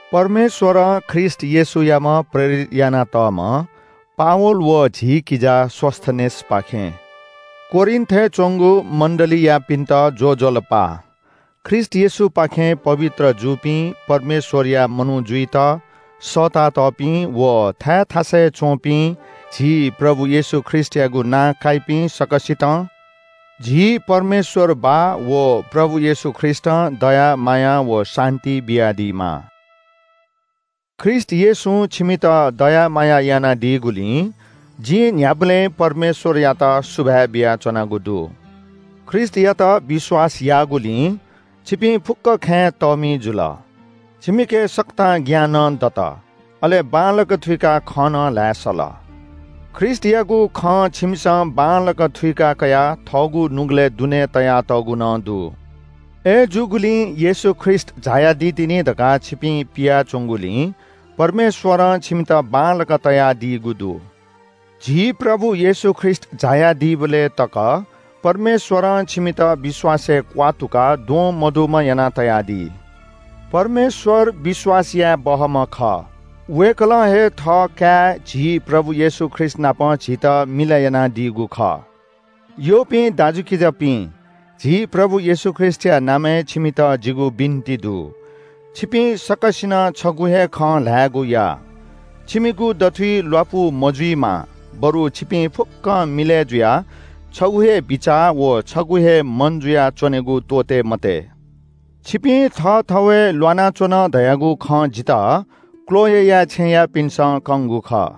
परमेश्‍वरं ख्रीष्‍ट येशूयाम्‍ह प्रेरित यानातःम्‍ह पावल व झी किजा सोस्‍थेनेसपाखें कोरिन्‍थय् च्‍वंगु मण्‍डलीयापिन्‍त ज्‍वजलपा! ख्रीष्‍ट येशूपाखें पवित्र जूपिं परमेश्‍वरया मनू जुइत सःतातःपिं व थाय् थासय् च्‍वंपिं झी प्रभु येशू ख्रीष्‍टयागु नां काइपिं सकसितं झी परमेश्‍वर बाः व प्रभु येशू ख्रीष्‍टं दया माया व शान्‍ति बियादीमा। ख्रीष्‍ट येशूं छिमित दया माया यानादीगुलिं जिं न्‍ह्याबलें परमेश्‍वरयात सुभाय् बियाच्‍वनागु दु। ख्रीष्‍टयात विश्‍वास याःगुलिं छिपिं फुक्‍क खँय् तःमि जुल। छिमिके सकतां ज्ञान नं दत, अले बांलाक थुइकाः खँ नं ल्‍हाये सल। ख्रीष्‍टयागु खँ छिमिसं बांलाक थुइका कयाः थःगु नुगलय् दुने तयातःगु नं दु। अय्‌जूगुलिं येशू ख्रीष्‍ट झायादी तिनि धकाः छिपिं पियाच्‍वंगुलिं छिमित छुं नं आत्‍मिक वरदान मगाःमचाः जुइ मखु। झी प्रभु येशू ख्रीष्‍ट झायादीबलय् तक परमेश्‍वरं छिमित विश्‍वासय् क्‍वात्तुकाः द्वं मदुम्‍ह यानातयादी। परमेश्‍वर विश्‍वास याये बहःम्‍ह खः। वय्‌कलं हे थःकाय्, झी प्रभु येशू ख्रीष्‍टनाप झीत मिलय् यानादीगु खः। यःपिं दाजुकिजापिं, झी प्रभु येशू ख्रीष्‍टया नामय् छिमित जिगु बिन्‍ति दु – छिपिं सकसिनं छगू हे खँ ल्‍हायेगु या। छिमिगु दथुइ ल्‍वापु मजुइमा बरु छिपिं फुक्‍कं मिलय् जुयाः छगू हे बिचाः व छगू हे मन जुयाच्‍वनेगु त्‍वःते मते। छिपिं थःथवय् ल्‍वानाच्‍वन धयागु खँ जितः क्‍लोएया छेँयापिन्‍सं कंगु खः।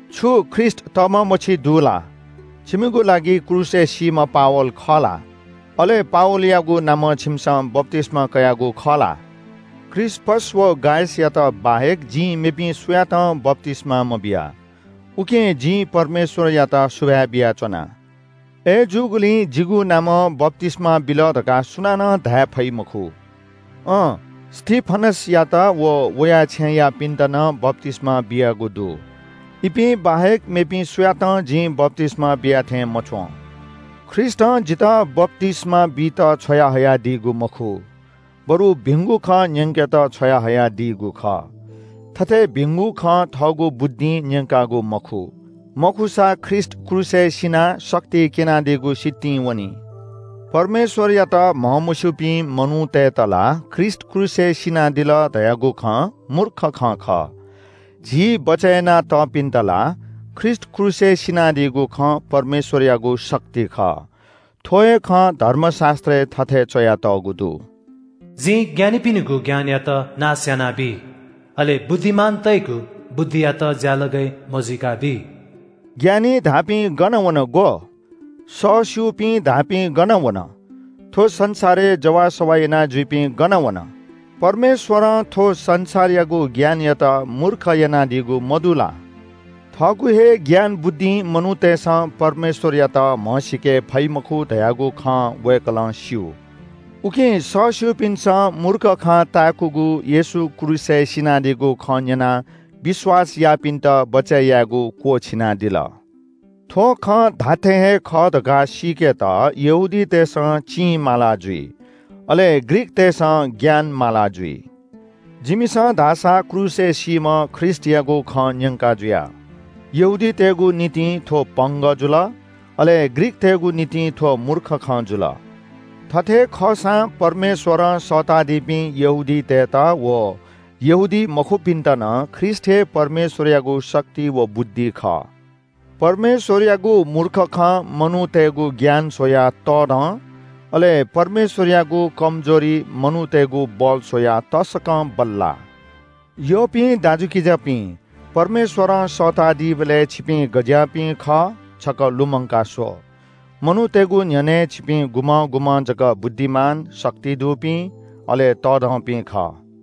छु ख्रीष्‍ट तःम्‍ह मछि दु ला? छिमिगु लागि क्रूसय् सीम्‍ह पावल खः ला? अले पावलयागु नामं छिमिसं बप्‍तिस्‍मा कयागु खः ला? क्रिस्‍पस व गायसयात बाहेक जिं मेपिं सुयातं बप्‍तिस्‍मा मबिया। उकिं जिं परमेश्‍वरयात सुभाय् बियाच्‍वना। अय्‌जूगुलिं जिगु नामं बप्‍तिस्‍मा बिल धकाः सुनानं धाये फइ मखु। अँ, स्‍तिफनसयात व वया छेँयापिन्‍त नं बप्‍तिस्‍मा बियागु दु। इपिं बाहेक मेपिं सुयातं जिं बप्‍तिस्‍मा बिया थें मच्‍वं। ख्रीष्‍टं जितः बप्‍तिस्‍मा बीत छ्वयाहयादीगु मखु, बरु भिंगु खँ न्‍यंकेत छ्वयाहयादीगु खः। थथे भिंगु खँ थःगु बुद्धिं न्‍यंकागु मखु। मखुसा ख्रीष्‍ट क्रूसय् सिनाः शक्ति क्‍यनादीगु सितिं वनी। परमेश्‍वरयात म्‍हमस्‍यूपिं मनूतय्‌त ला ख्रीष्‍ट क्रूसय् सिनादिल धयागु खँ मूर्ख खँ खः। झी बचय् यानातःपिन्‍त ला ख्रीष्‍ट क्रूसय् सिनादीगु खँ परमेश्‍वरयागु शक्ति खः। थ्‍व हे खँ धर्मशास्‍त्रय् थथे च्‍वयातःगु दु – “जिं ज्ञानीपिनिगु ज्ञानयात नाश यानाबी, अले बुद्धिमानतय्‌गु बुद्धियात ज्‍यालगय् मजुइकाबी।” ज्ञानी धाःपिं गन वन ग्‍व? सःस्‍यूपिं धाःपिं गन वन? थ्‍व संसारय् जवाःसवाः यानाजुइपिं गन वन? परमेश्‍वरं थ्‍व संसारयागु ज्ञानयात मूर्ख यानादीगु मदु ला? थःगु हे ज्ञान बुद्धिं मनूतय्‌सं परमेश्‍वरयात म्‍हसीके फइ मखु धयागु खँ वय्‌कलं स्‍यू। उकिं सःस्‍यूपिन्‍सं मूर्ख खँ ताय्‌कूगु येशू क्रूसय् सिनादीगु खँ न्‍यनाः विश्‍वास याःपिन्‍त बचय् यायेगु क्‍वःछिनादिल। थ्‍व खँ धात्‍थें हे खः धकाः सीकेत यहूदीतय्‌सं चिं माला जुइ, अले ग्रीकतय्‌सं ज्ञान माला जुइ। जिमिसं धाःसा क्रूसय् सीम्‍ह ख्रीष्‍टयागु खँ न्‍यंका जुया। यहूदीतय्‌गु निंतिं थ्‍व पंगः जुल, अले ग्रीकतय्‌गु निंतिं थ्‍व मूर्ख खँ जुल। थथे खःसां परमेश्‍वरं सःताःदीपिं यहूदीतय्‌त व यहूदीमखुपिन्‍त नं ख्रीष्‍ट हे परमेश्‍वरयागु शक्ति व बुद्धि खः। परमेश्‍वरयागु मूर्ख खँ मनूतय्‌गु ज्ञान स्‍वयाः तःधं, अले परमेश्‍वरयागु कमजोरी मनूतय्‌गु बल स्‍वयाः तसकं बल्‍लाः। यःपिं दाजुकिजापिं, परमेश्‍वरं सःतादीबलय् छिपिं गज्‍याःपिं खः छकः लुमंका स्‍व। मनूतय्‌गु न्‍ह्यःने छिपिं गुम्‍हं गुम्‍हं जक बुद्धिमान, शक्ति दुपिं, अले तःधंपिं खः।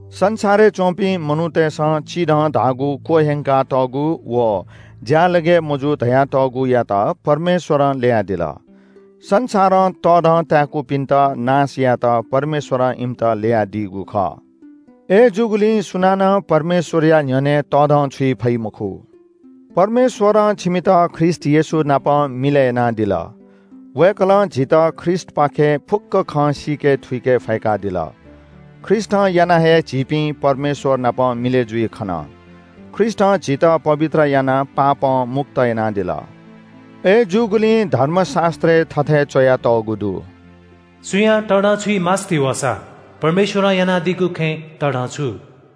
संसारय् च्‍वंपिं मनूतय्‌सं चिधं धाःगु, क्‍वह्यंकातःगु व ज्‍यालगय् मजू धयातःगुयात परमेश्‍वरं ल्‍ययादिल। संसारं तःधं ताय्‌कूपिन्‍त नाश यायेत परमेश्‍वरं इमित ल्‍ययादीगु खः। अय्‌जूगुलिं सुनानं परमेश्‍वरया न्‍ह्यःने तःधंछुइ फइ मखु। परमेश्‍वरं छिमित ख्रीष्‍ट येशू नाप मिलय् यानादिल। वय्‌कलं झीत ख्रीष्‍टपाखें फुक्‍क खँ सीके थुइके फय्‌कादिल। ख्रीष्‍टं यानाः हे झीपिं परमेश्‍वर नाप मिलय् जुइ खन। ख्रीष्‍टं झीत पवित्र यानाः पापं मुक्त यानादिल। अय्‌जूगुलिं धर्मशास्‍त्रय् थथे च्‍वयातःगु दु – “सुयां तःधंछुइ मास्‍ति वःसा परमेश्‍वरं यानादीगु खँय् तःधंछु।”